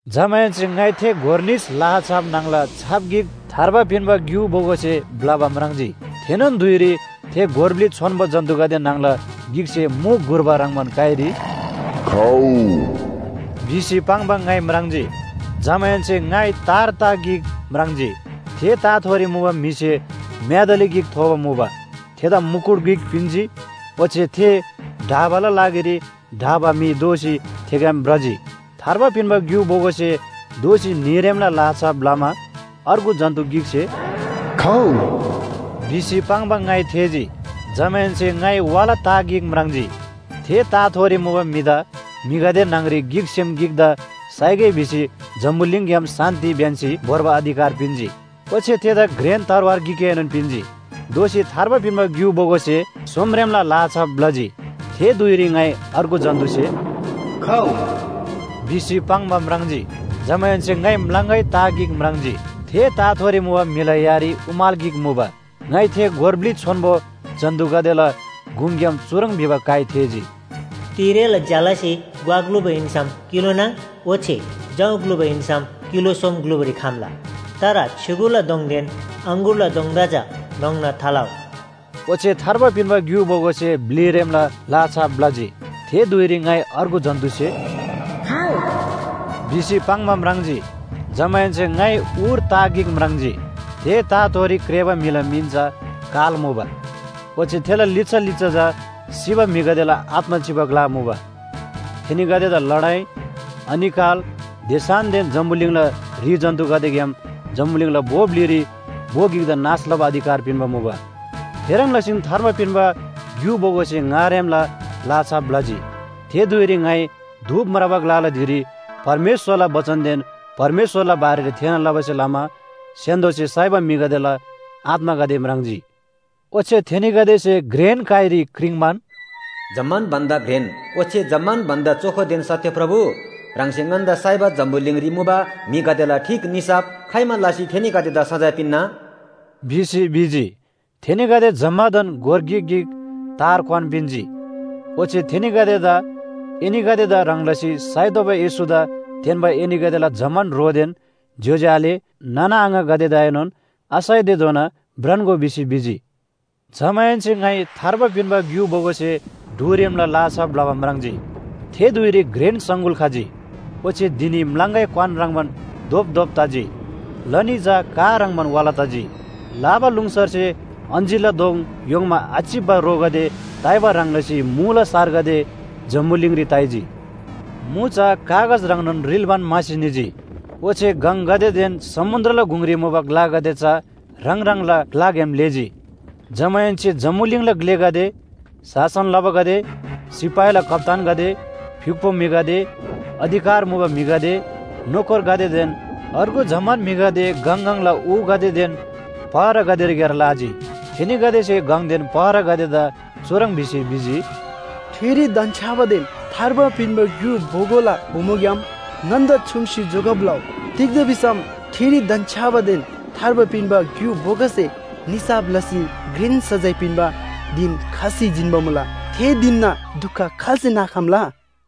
जमाहेन्‍से ङाइ थे गोर निस लाहा छाप न्‍हङला छाप गिक थार्बा पिन्‍बा ग्‍यु बोगोसे ब्‍लबा म्राङ्जी। थेनोन धुइरी थे गोर ब्‍लि छोन्‍बो जन्‍तुगदे न्‍हङला गिकसे मु घुर्बा ह्रङ्‌बान काइरी “खउ” भिसी पाङ्बा ङाइ म्राङ्जी। जमाहेन्‍से ङाइ तार ता गिक म्राङ्जी। थे ताथोरी मुबा म्‍हिसे म्‍यादली गिक थोबा मुबा। थेदा मुकुट गिक पिन्‍जी, ओच्‍छे थे ढाबाला लागिरी ढाबा म्‍हि दोःसी थेग्‍याम भ्रजी। थार्बा पिन्‍बा ग्‍यु बोगोसे दोःसी न्‍हीरेमला लाहा छाप ब्‍लमा अर्गु जन्‍तु गिकसे “खउ” भिसी पाङ्बा ङाइ थेःजी। जमाहेन्‍से ङाइ वाला ता गिक म्राङ्जी। थे ताथोरी मुबा म्‍हिदा म्‍हिगदे न्‍हङरी गिकसेम गिकदा साइगै भिसी जम्‍बुलिङग्‍याम शान्‍ति ब्‍यन्‍सी भोर्बा अधिकार पिन्‍जी। ओच्‍छे थेदा घ्रेन तरवार गिकएनोन पिन्‍जी। दोःसी थार्बा पिन्‍बा ग्‍यु बोगोसे सोमरेमला लाहा छाप ब्‍लजी। थे धुइरी ङाइ अर्गु जन्‍तुसे “खउ” भिसी पाङ्बा म्राङ्जी। जमाहेन्‍से ङाइ म्‍लाङगै ता गिक म्राङ्जी। थे ताथोरी मुबा म्‍हिला यारी उमाल गिक मुबा। ङाइ थे गोर ब्‍लि छोन्‍बो जन्‍तुगदेला गुङग्‍याम चुह्रङ् भिबा काइ थेःजी। “तिरेला ज्‍यालासे ग्‍वा ग्‍लुबा हिन्‍सम किलो नाङ ओच्‍छे जौ ग्‍लुबा हिन्‍सम किलो सोम ग्‍लुबारी खम्‍ला। तर छ्‌युगुला दोङदेन अङगुरला दोङदा चा न्‍होङ्ना थालउ। ओच्‍छे थार्बा पिन्‍बा ग्‍यु बोगोसे ब्‍लिरेमला लाहा छाप ब्‍लजी। थे धुइरी ङाइ अर्गु जन्‍तुसे “खउ” भिसी पाङ्बा म्राङ्जी। जमाहेन्‍से ङाइ उर ता गिक म्राङ्जी। थे ताथोरी क्रेःबा म्‍हिला मिन चा “काल” मुबा। ओच्‍छे थेला लिच्‍छा लिच्‍छा चा सिबा म्‍हिगदेला आत्‍मा चिबा ग्‍ला मुबा। थेनीगदेदा लडाइ, अनिकाल, देसानदेन जम्‍बुलिङला ह्रि जन्‍तुगदेग्‍याम जम्‍बुलिङला भो ब्‍लिरी भो गिकदा नाश लबा अधिकार पिन्‍बा मुबा। थेह्रङ् लसीन थार्बा पिन्‍बा ग्‍यु बोगोसे ङारेमला लाहा छाप ब्‍लजी। थे धुइरी ङाइ धूप म्राबा ग्‍लाला धिरी परमेश्‍वरला बचनदेन परमेश्‍वरला बारेरी थेःना लबासे लमा स्‍य्‍हान्‍दोसे साइबा म्‍हिगदेला आत्‍मागदे म्राङ्जी। ओच्‍छे थेनीगदेसे घ्रेन काइरी क्रिङ्‌बान, “जम्‍मान भन्‍दा घ्रेन ओच्‍छे जम्‍मान भन्‍दा चोखोदेन सत्‍य प्रभु, ह्राङसे ङन्‍दा साइबा जम्‍बुलिङरी मुबा म्‍हिगदेला ठीक निसाफ खाइमा लसी थेनीगदेदा सजाय पिन्‍ना?” भिसी भिजी। थेनीगदे जम्‍मादान गोर गिक गिक तार क्‍वान पिन्‍जी। ओच्‍छे थेनीगदेदा एनीगदेदा ह्रङ् लसी साइतोःबा येशूदा तेन्‍बा एनीगदेला जम्‍मान ह्रोदेन ज्‍योज्‍यो आले नाना आङागदेदाएनोन आसाइतेधोना भ्रान्‍गो भिसी भिजी। जमाहेन्‍से ङाइ थार्बा पिन्‍बा ग्‍यु बोगोसे ढुरेमला लाहा छाप ब्‍लबा म्राङ्जी। थे धुइरी घ्रेन सङगुल खजी। ओच्‍छे धिनी म्‍लाङगै क्‍वान ह्रङ्‌बान धोपधोप तजी, लनी चा का ह्रङ्‌बान वाला तजी। लाबालुङसरसे अञ्‍जीरला दोङ य्‍होङ्‍मा आचिप्‍बा रोगदे ताइबा ह्रङ् लसी मुला सारगदे जम्‍बुलिङरी ताइजी। मु चा कागज ह्रङ्नोन रिल्‍बान म्‍हासी निजी। ओच्‍छे गङगदेदेन समुन्‍द्रला गुङरी मुबा ग्‍लागदे चा ह्राङ ह्राङला ग्‍लाग्‍याम लेःजी। जमाहेन्‍से जम्‍बुलिङला ग्‍लेगदे, शासन लबागदे, सिपाहीला कप्‍तानगदे, फ्‍युक्‍पो म्‍हिगदे, अधिकार मुबा म्‍हिगदे, नोकरगदेदेन अर्गु जम्‍मान म्‍हिगदे गङ गङला ऊगदेदेन पहरागदेरीक्‍यार लाजी। थेनीगदेसे गङदेन पहरागदेदा चुह्रङ् भिसी भिजी, “ठिरी धन्‍छ्‌याबादेन थार्बा पिन्‍बा ग्‍यु बोगोला बोमोग्‍याम ङन्‍दा छुम्‍सी जोगब लउ। तिग्‍दा भिसम ठिरी धन्‍छ्‌याबादेन थार्बा पिन्‍बा ग्‍यु बोगोसे निसाफ लसी घ्रेन सजाय पिन्‍बा धिन खसी जिन्‍बा मुला। थे धिनना दुख खाल्‍से नाखम्‍ला?”